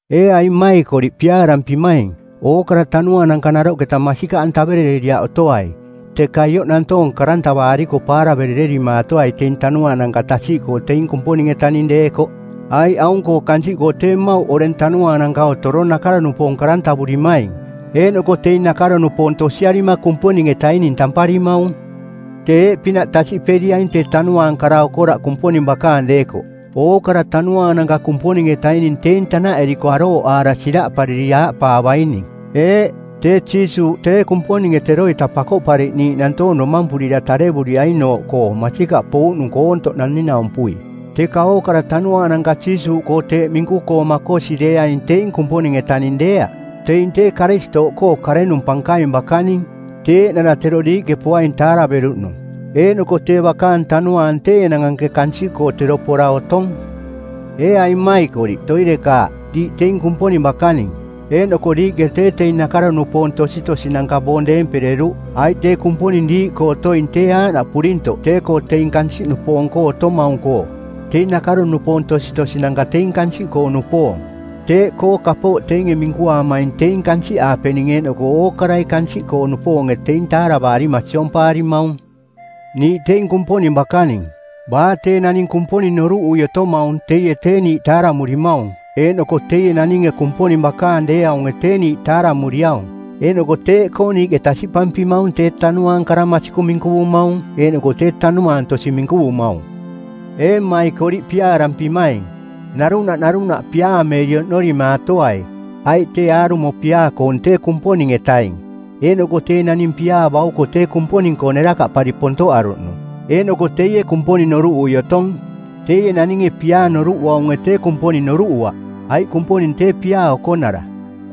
Ee aing mmaikoriꞌ piaarampimaing, ookara tanuaananka naroꞌketa masikaꞌantaverereriaꞌ otoai, teka ioꞌ nantoong karantavaariko˜ paaraverererimaatoai teing tanuaananka tasiꞌkoo teing Kumponing-etaning deekoꞌ, aiꞌ aung-koo kansiꞌkoo tee mmauꞌ oreng tanuaananka otorong nakaro-nupoong˜ karantavurimaing, eeꞌnoko teing nakaro-nupoong tosiarima Kumponing-etaining tamparimaung. Tee eeꞌpinaꞌ tasiꞌperiaing tee tanuaang kara okoraꞌ Kumponing bakaang deekoꞌ: ookara tanuaananka Kumponing-etaining teing tanaꞌeriko arooꞌaara siraꞌpariri aaꞌpaavaining, “Eeꞌ, tee Jiisuuꞌ, tee Kumponinge teroita Pakoꞌpariꞌniiꞌ nantoong domampurira tarevuriainooꞌ koo masikaꞌ pouꞌnung koontoꞌ naning-naumpui.” Teka ookara tanuaananka Jiisuuꞌkoo teeꞌ minku-koo makosi deeaing teing Kumponing-etaning deeaꞌ. Teing tee Karistooꞌkoo karenung pankaing bakaning, tee eeꞌnara tero diiꞌke poaing taaraveruꞌnung, eeꞌnoko tee bakaang tanuaang tee enang anke kansiꞌkoo tero pora otong. Ee aing mmaikoriꞌ, toirekaaꞌ, diiꞌ teing Kumponing bakaning eeꞌnoko diiꞌke tee teing nakaro-nupoong tositosinanka boong deempereruꞌ, aiꞌ tee Kumponing diiꞌkoo otoing tee aaꞌnaꞌ purintoꞌ tee-koo teing kansiꞌnupoong-koo otomaung-koo. Teing nakaro-nupoong tositosinanka teing kansiꞌkoo-nupoong, teeꞌkoo kapooꞌ teinge minkuaamaing teing kansiꞌaapening eeꞌnoko ookarai kansiꞌkoo-nupoonge teing taaravaarima siompaarimaung. Niiꞌ teing Kumponing bakaning. Baa tee naning Kumponing noruꞌui otomaung teie tee niiꞌ taaramurimaung eeꞌnoko teie naninge Kumponing bakaang deeaunge tee niiꞌ taaramuriaung, eeꞌnoko teeꞌkoo niiꞌke tasiꞌpampimaung tee Tanuaang kara masikung minkuvumaung eeꞌnoko tee tanuaang tosi minkuvumaung. Ee mmaikoriꞌ piaarampimaing, narunaꞌ narunaꞌ piaameeri oꞌnorimaatoai, aiꞌ tee aarumo piaa-koong tee Kumponing-etaing, eeꞌnoko tee naning piaa bauko tee Kumponing-koo nerakaꞌpari pontoꞌaruꞌnung, eeꞌnoko teie Kumponing noruꞌui otong. Teie naninge piaa noruꞌuaunge tee Kumponing noruꞌuaꞌ, aiꞌ Kumponing tee piaa okonara.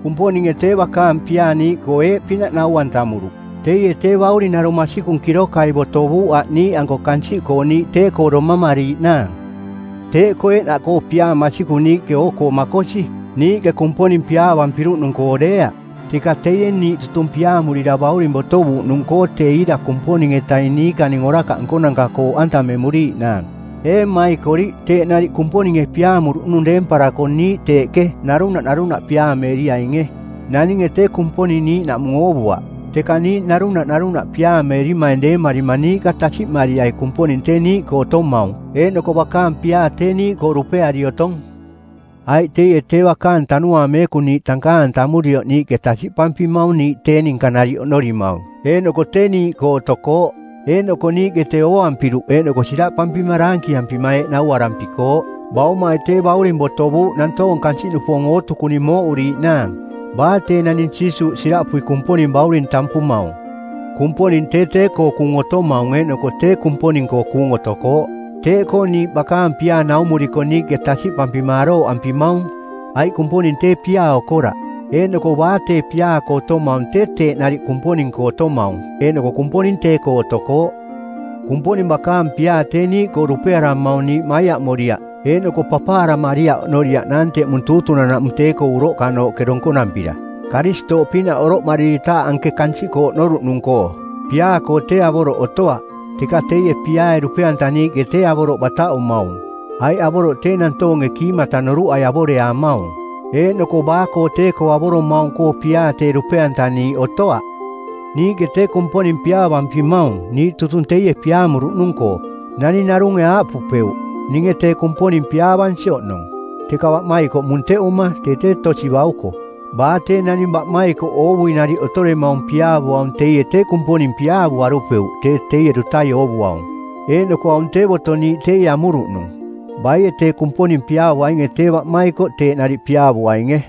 Kumponinge tee bakaang piaa niiꞌkoo eeꞌpinaꞌ nau-antamuruꞌ: Teie tee Bauring narung masikung kirokai botovuuꞌ aꞌ niiꞌanko kansiꞌkoo niiꞌ tee-koo domamariiꞌnaang. Teeꞌkoo eeꞌnaꞌkoo piaa masikung niiꞌke oo-koo makosi, niiꞌke Kumponing piaavampiruꞌnung-koo deeaꞌ, teka teie niiꞌ tutung piaamurira Bauring botovuuꞌnung-koo tee iira Kumponing-etaing niikaning orakaꞌ nkonanka-koo oꞌantamemuriiꞌnaang. Ee mmaikoriꞌ, teeꞌ nariꞌ Kumponinge piaamuruꞌnung deemparako niiꞌ teeꞌke narunaꞌ narunaꞌ piaameeriainge. Naninge tee Kumponing niiꞌnaꞌmung oovuaꞌ; teka niiꞌ narunaꞌ narunaꞌ piaameerimaing deemarima niiꞌka tasiꞌmariai Kumponing tee niiꞌkoo otomaung eeꞌnoko bakaang piaa tee niiꞌkoo dupeari otong. Aiꞌ teie tee bakaang Tanuaang Meekung niiꞌ tankaang-antamurioꞌ niiꞌke tasiꞌpampimaung niiꞌ tee ninka nariꞌ oꞌnorimaung eeꞌnoko tee niiꞌkoo otokooꞌ. Eeꞌnoko niiꞌke tee ooampiruꞌ eeꞌnoko siraꞌpampima daankiampima eeꞌ nauarampikooꞌ, “Baumai tee Bauring botovuuꞌ nantoong kansiꞌnupoong ootukuning mooꞌuriiꞌnaang.” Baa tee naning Jiisuuꞌ siraꞌpui Kumponing Bauring tampumaung, Kumponing tee tee-koo kuung otomaung eeꞌnoko tee Kumponing-koo kuung otokooꞌ. Teeꞌkoo niiꞌ bakaang piaa naumuriko niiꞌke tasiꞌpampima arooꞌampimaung, aiꞌ Kumponing tee piaa okoraꞌ, eeꞌnoko baa tee piaa-koo otomaung tee teeꞌ nariꞌ Kumponing-koo otomaung eeꞌnoko Kumponing tee-koo otokooꞌ. Kumponing bakaang piaa tee niiꞌkoo dupearamaung niiꞌ maiaꞌmoriaꞌ eeꞌnoko papaaramariaꞌ oꞌnoriaꞌnaang teꞌmung tuutunan-naꞌmung tee-koo uroꞌkanooꞌke donkonampira, Karistooꞌpinaꞌ oroꞌmariritaaꞌ anke kansiꞌkoo oꞌnoruꞌnung-koo. Piaa-koo tee avoroꞌ otoaꞌ, teka teie piaae dupe-antaniiꞌke tee avoroꞌ bataꞌumaung. Aiꞌ avoroꞌ tee nantoonge kiimata noruꞌai avoreaamaung. Eeꞌnoko baa-koo tee-koo avoromaung-koo piaa tee dupe-antaniiꞌ otoaꞌ. Niiꞌke tee Kumponing piaavampimaung niiꞌ tutung teie piaamuruꞌnung-koo. Naning narunge aaꞌpupeuꞌ, “Ninge tee Kumponing piaavansi oꞌnong,” teka baꞌmaikoꞌ munteꞌuma tee tee tosi bauko. Baa tee naning tee baꞌmaikoꞌ oovui nariꞌ otoremaung piaavuaung teie tee Kumponing piaavuarupeuꞌ tee teie dutai oovuaung. Eeꞌnoko aung tee boto niiꞌ teie amuruꞌnung, “Baie tee Kumponing piaavuainge tee baꞌmaikoꞌ teeꞌ nariꞌ piaavuainge.”